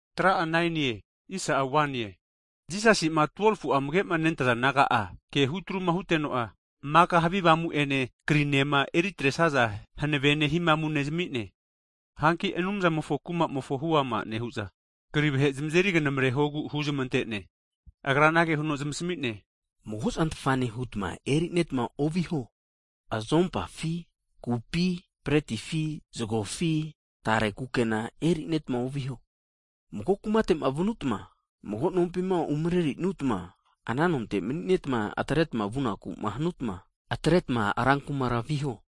Hagi Jisasi'ma 12fu'a amage'ma nentaza disaipol naga'a ke hutruma huteno maka havi avamu'ene krinema eritresaza hanavene hihamune zami'ne. Hanki Anumzamofo Kumamofonku huama nehu'za, kri vahe zamazeri knamarehogu huzmante'ne. Agra anage huno zamasami'ne, Mago zantfane hutma erineta oviho. Azompafi kupi bretifi zagofi tare kukena erinetma oviho. Mago kumate'ma vutma mago nompima umrerinutma, ana nonte manineta, atreta vunakuma hanutma, atretma rankumara viho.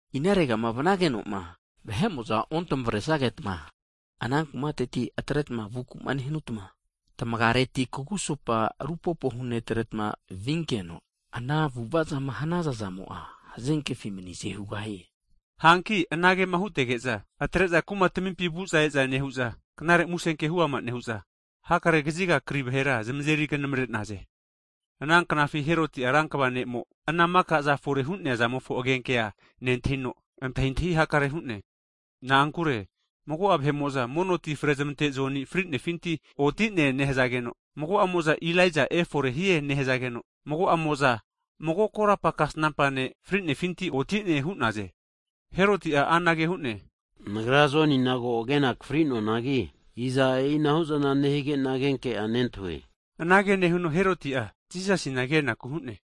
Inaregama vanagenoma vahe'mo'za ontamaresnageta, ana kumateti atreta vukuma hanuta, tamagiareti kugusopa rupopo hunetretma vinkeno, ana avu'avazama hanaza zamo'a hazenkefi manize hugahie. Hanki anage'ma hutege'za, atre'za kumatamimpi vu'za eza nehu'za, Knare Musenke huama nehu'za, hakare kaziga kri vahera zamazeri knamare'naze. Ana knafina Heroti'a rankva ne'mo, ana makazama fore hu'nea zamofo agenke'a nentahino, antahintahi hakare hu'ne. Na'ankure mago'a vahe'mo'za mono ti frezamante Joni frinefinti oti'ne nehazageno, mago'amo'za Elaija efore hie nehazageno, mago'amo'za mago korapa kasnampa ne' fri'nefinti oti'ne hu'naze. Heroti'a anage hu'ne, nagra Jonina ko agena akafri'noanagi, iza e'inahuzana nehige'na agenke'a nentahue? Anage nehuno, Herotia Jisasina kenaku hu'ne.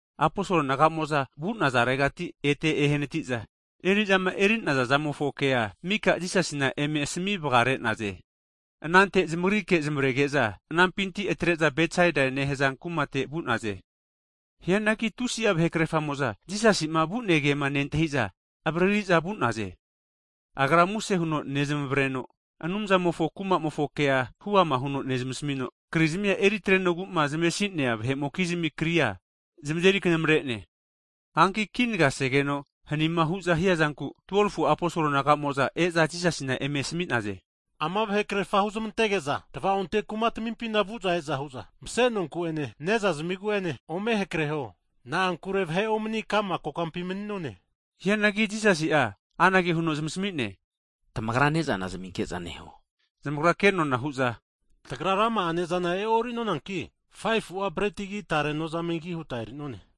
Aposolo naga'mo'za vu'nazaregati ete ehanatiza, eri'zama eri'naza zamofonkea mika Jisasina eme asami vagare'naze. Anante zamagrike zamavarege'za anampinti atre'za Betsaide nehaza kumate vu'naze. Hianagi tusi'a vahe krerfamo'za Jisasi'ma vu'ne kema nentahiza avaririza vu'naze. Agra muse huno nezamavareno, Anumzamofo kumamofo ke huama huno nezmasamino, krizmima eri atrenogu'ma zamesi'nea vahe'mokizmi kria zamazeri knamare'ne. Hanki kinagaseno hanima hu'za hiazanku, 12fu'a disaipol naga'mo'za e'za Jisasina anage hu'za eme asami'naze. Ama vahe krefa huzmantege'za tva'onte kuma tamimpina vu'za e'za hu'za mase nonku'ene, ne'za zimigu'ene ome hakreho. Na'ankure vahe omani kokampi mani'none. Hianagi Jisasi'a anage huno zamasami'ne, Tamagra ne'zana zaminke'za neho. Zamagra kenona hu'za, tagra rama'a ne'zana e'orinonanki, 5fu'a bretigi tare nozamegi huta eri'none.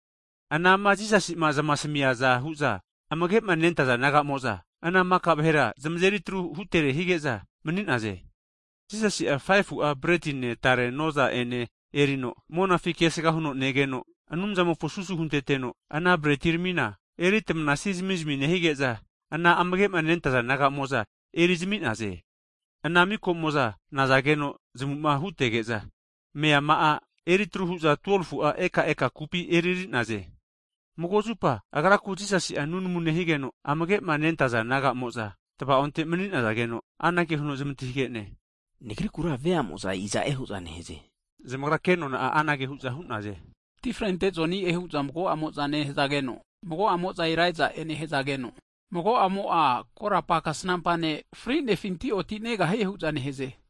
Anama Jisasi'ma zamasamiaza hu'za amagema nentaza disaipol naga'mo'za, ana maka vahera zamazeri atru hutere hazage'za mani'naze. Jisasi'a 5fu'a bretine tare noza'ene erino, monafi kesga huno negeno, Anumzamofo susu hunteteno, ana bretiramina eritamanasi zamizmi nehige'za, ana amagema nentaza disaipol naga'mo'za ana ne'zana eri'zami'naze. Ana mikomo'za nazageno zamuma hutege'za, meama'a eritru hu'za 12fu'a eka eka kupi eriri'naze. Mago zupa agraku Jisasi'a nunamu nehigeno, amagema nentaza disaipol naga'mo'za, tava'onte emani'nazageno anage huno zamantahige'ne, Nagrikura veamo'za iza'e hu'za neheze? Hige'za zamagra kenona'a anage hu'za hu'naze, mono ti frente Joni'e hu'za mago'amo'za nehazageno, mago'amo'za Elaija'e nehazageno, mago'amo'a korapa kasnampa ne' frinefinti oti'ne hu'za nehaze.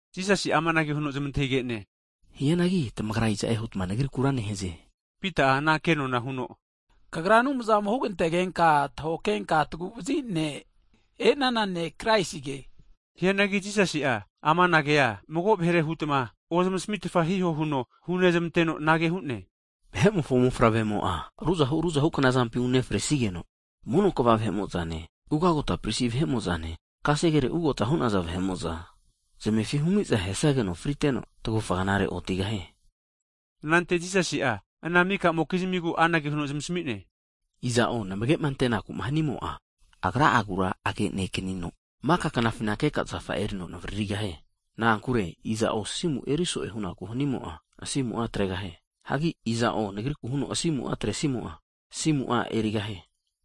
Jisasi'a amanage huno zamantahige'ne. Hianagi tamagra iza'e hutma Nagrikura nehaze? Pita'a ana kenona huno, Kagra Anumzamo hugantegenka (tahoke henka tagu'vazi ne' e'nana ne' Kraisige. Hianagi Jisasi'a amana kea mago vahere hutma ozmasmitfa hiho huno hunezmante'no, anage hu'ne, Vahe'mofo mofavremo'a ruzahu ruzahu knazampi unefresige'za, mono kva vahe'mo'zane, ugagota pristi vahe'mo'zane, kasegere ugota hu'naza vahe'mo'za, zamefi humiza ahesageno friteno, tagufa zagegnare otigahie. Anante Jisasi'a ana maka'mokizmigu anage huno zamasami'ne, Iza'o namage'ma antenaku'ma hanimo'a, agra'agura age'nekanino maka knafina keka zafa'a erino navaririgahie. Na'ankure iza'o asimu'a eriso'e hu'naku hanimo'a, asimu'a atregahie. Hagi iza'o Nagriku huno asimu'a atresimo'a, asimu'a erigahie.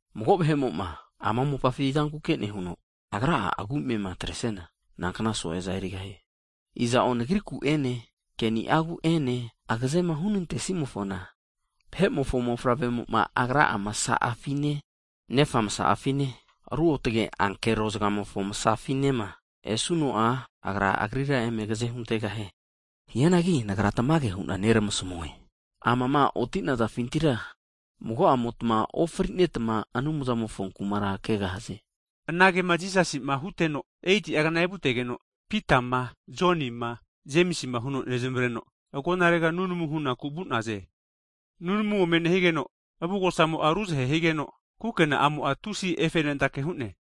Mago vahe'mo'ma ama mopafi zankuke nehuno, agra'a agu'amema atresiana, nankna so'eza erigahie. Iza'o nagriku'ene keniagu'ene agazema hunante'simofona, Vahe'mofo Mofavremo'ma Agra'a masa'afine, Nefa masa'afine ruotge ankero vahe zagamofo masafinema esuno'a agrira eme agaze huntegahie. Hianagi Nagra tamage hu'na neramasamue, amama otinazafintira, mago'amotma ofrinetma Anumzamofo kumara kegahaze. Anagema Jisasima huteno, 8'a zagegnanaza evutegeno, Pitama, Jonima, Jemisima, huno zamavarege'za, agonarega nunamu hunaku vu'naze. Nunamuma ome nehigeno, avugosamo'a ruzahu higeno, kukena amo'a tusi efe'nentake hu'ne.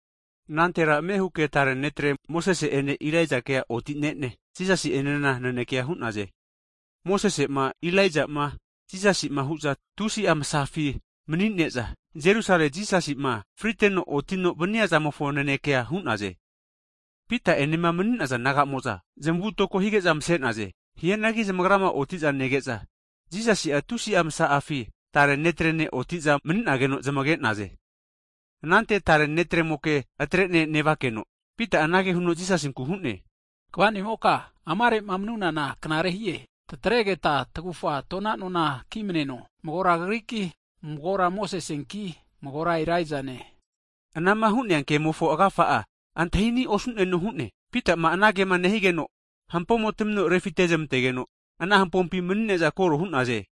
Anantera ame huke tare netre Mose'ene Elaijakea oti'nene, Jisasi'enena nanekea hu'naze. Mosese'ma Elaija'ma Jisasi'ma hu'za tusi'a masafi mani'ne'za, Jerusalema Jisasi'ma friteno otino vaniazamofo nanekea hu'naze. Pita enema mani'naza naga'mo'za zamavutoko hige'za mase'naze. Hianagi zamagrama oti'za nege'za, Jisasi'a tusi'a masa'afi tare netrene oti'za mani'nageno zamage'naze. Anante tare netremoke atrene nevakeno, Pita'a anage Jisasinku hu'ne. Kva'nimoka, amare'ma manunana knare hie. Tatregeta tagufa tona nona kimneno, magora Kagriki, magora Mosesenki, magora Elaijane. Anama hu'nea kemofo agafa'a antahini' osu'neno hu'ne. Pita'a anagema nehigeno'a, hampomo tamino refite nezmentegeno, ana hampompi mani'ne'za koro hu'naze.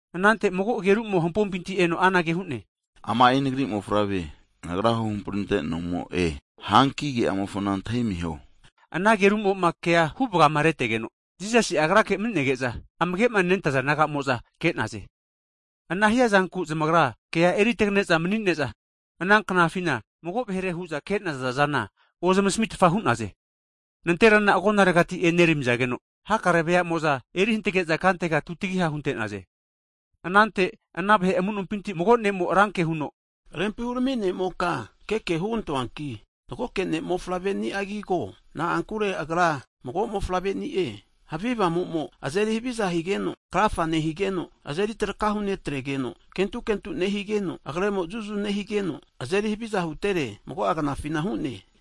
Anante mago agerumo hampompinti anage hu'ne. Ama'i Nagri Mofavre, Nagra huhampri ante'nomo'e. Hanki ke'amofona antahimiho. Ana agerumo'ma kea huvagama retegeno, Jisasi'a Agrake mani'nege'za amagema nentaza disaipol naga'mo'za ke'naze. Ana hiazanku zamagra kea eri tagane'za mani'ne'za, ana knafina mago vahere hu'za ke'naza'zana ozmasamitfa hu'naze. Nanterana agonaregati eneramizageno, hakare veamo'za eri hantage'za kantega tutagiha hunte'naze. Anante ana vahe amu'nompinti mago nemo'a ranke huno, Rempi hurami ne'moka, keke hugantoanki, magoke ne'mofavre'niagi ko. Na'ankure agra mago mofavre'ni'e! Havi avamumo azeri haviza higeno krafa nehigeno, azeri traka hunetregeno, kentu kentu nehigeno, agremo zuzu nehigeno, azeri haviza hutere mago'agnafina nehie.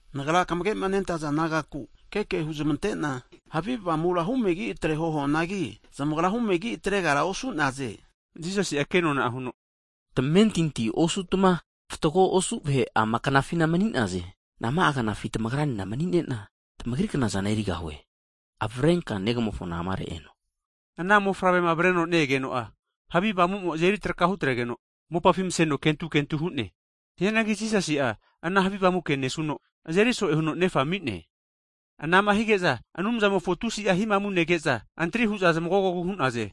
Nagra kamagema nentaza disaipol nagaku keke huzmante'na, havi avamura humegi atreho huanagi, zamagra humegi atregara osu'naze. Jisasi'a kenona huno, Tamentinti osutma fatgo osu vahe ama knafina mani'naze. Nama'a knafi tamagranena mani'nena tamagri knazana erigahue? Avrenka negamofona amare eno. Ana mofavrema avreno ne-egeno'a havi avamumo azeri traka hutregeno, mopafi maseno kentu kentu hu'ne. Hianagi Jisasi'a ana havi avamu ke nesuno, azeri so'e huteno nefana ami'ne. Anama hige'za Anumzamofo tusi'a hihamuma nege'za, antri hu'za zmagogogu hu'naze.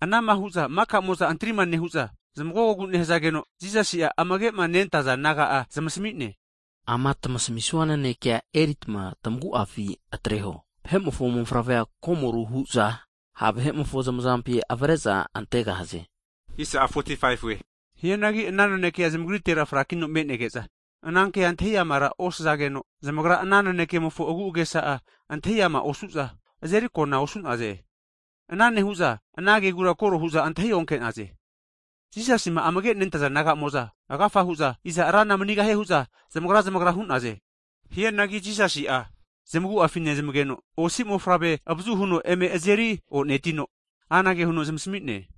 Anama hu'za mika'mo'za antrima nehu'za zamagogogu nehazageno, Jisasi'a amage'ma nentaza naga'a zamasami'ne. Ama tmasamisua nanekea eritma tamagu'afi anteho. Vahe'mofo Mofavrea komoru hu'za ha' vahe'mofo zamazampi avre'za antegahaze. Hianagi ana nanekea zamagritera frakino me'nege'za anankea antahi amara osazageno, zamagra ana nanekemofo agu'agesa'a antahi ama osu'za, azeri akona osu'naze. Ana nehu'za ana kegura koro hu'za antahi onke'naze. Jisasima amage nentaza disaipol naga'mo'za, agafa hu'za iza rana manigahie hu'za zamagra zamagra hu'naze. Hianagi Jisasi'a zamagu'afi nezmageno, osi mofavre avazu huno eme azeri o'netino, anage huno zamasami'ne,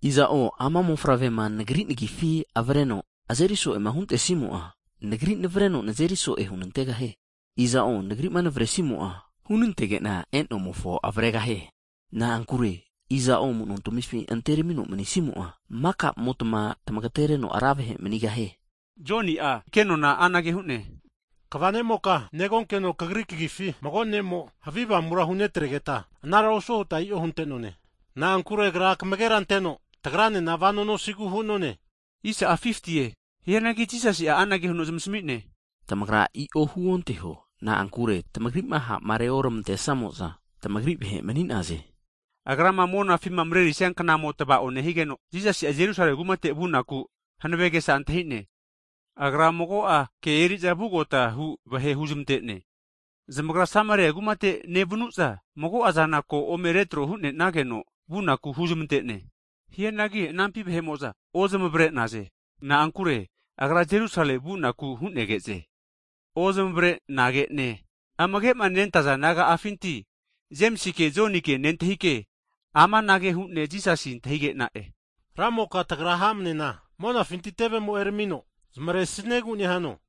Iza'o ama mofavrema Nagri Nagifi avreno azeri so'ema huntesimo'a, Nagri navareno nazeri so'e hunantegahie. Iza'o Nagri'ma naveresimo'a, hunantege'na e'nomofo avaregahie. Na'ankure iza'o amuno tamifi anteramino manisimo'a, maka'motma tamagatereno ra vahe manigahie. Joni'a kenona anage hu'ne, Kva nemoka, negonkeno Kagri kagifi, mago ne'mo havi avamura hunetregeta anara osuo huta i'o hunte'none. Na'ankure agra kamagera anteno tagranena vano nosigu hu'none. Hianagi Jisasi'a anage huno zamasami'ne, Tamagra i'o huonteho. Na'ankure tamagri'ma ha'ma reormantesamo'za, tamagri vahe mani'naze. Agrama monafima marerisia knamo tava'oma nehigeno, Jisasi'a Jerusalemi kumate vunaku hanave agesa antahi'ne. Agra mago'a ke eriza vugotahu vahe huzmante'ne. Zamagra Sameria kumate nevnu'za, mago'azana ko ome retro hu'nenageno vunaku huzmante'ne. Hianagi anampi vahe'mo'za ozamavare'naze. Na'ankure Agra Jerusalemi vunaku hu'negeze. Ozamavare'nage'ne amagema nentaza disaipol naga'afinti Jemisike Jonike nentahike amanage hu'ne Jisasina antahige'na'e. Ramoka tagra ha'manena monafinti tevemo eramino zamaresniegu nehano?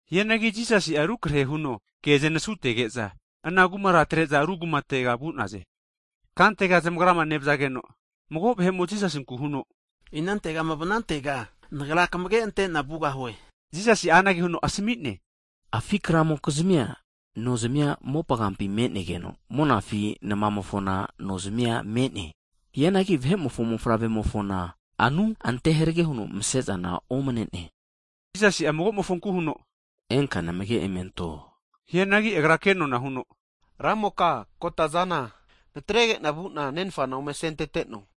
Hianagi Jisasi'a rukrahe huno ke'zanasutege'za, ana kumara atre'za ru kumatega vu'naze. Kantega zamagrama nevazageno, mago vahe'mo Jisasinku huno inantegama vanantega nagra kamage' ante'na vugahue. Hagi Jisasi'a anage huno asami'ne, Afi' kramokizmia nozimia mopagampi me'negeno, monafi namamofona nozamia me'ne. Hianagi Vahe'mofo Mofavre'mofona anu anteharege huno mase'zana omane'ne. Jisasi'a magomofonku huno, Enka namage emento. Hianagi agra ke'nona huno, Ramoka kotazana, natregena vuna nenfana ome asenteteno.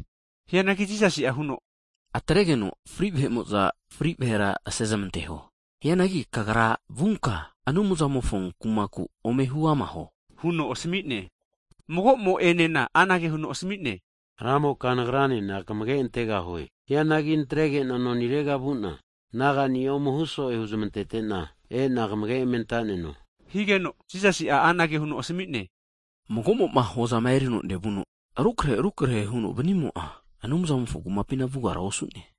Hianagi Jisasi'a huno, Atregeno fri vahe'mo'za, fri vahera asezmanteho. Hianagi kagra vunka Anumzamofo kumaku ome huama huo huno asami'ne. Mago'mo enena anage huno asami'ne, Ramoka nagranena kamage antegahue. Hianagi natrege'na nonirega vuna nagani'a ome huso'e huzmantetena, ena kamage emeantaneno higeno, Jisasi'a anage huno asami'ne, Mago'mo'ma hozama erino nevuno, rukrehe rukrehe huno vanimo'a, Anumzamofo Kumapina vugara osu'ne.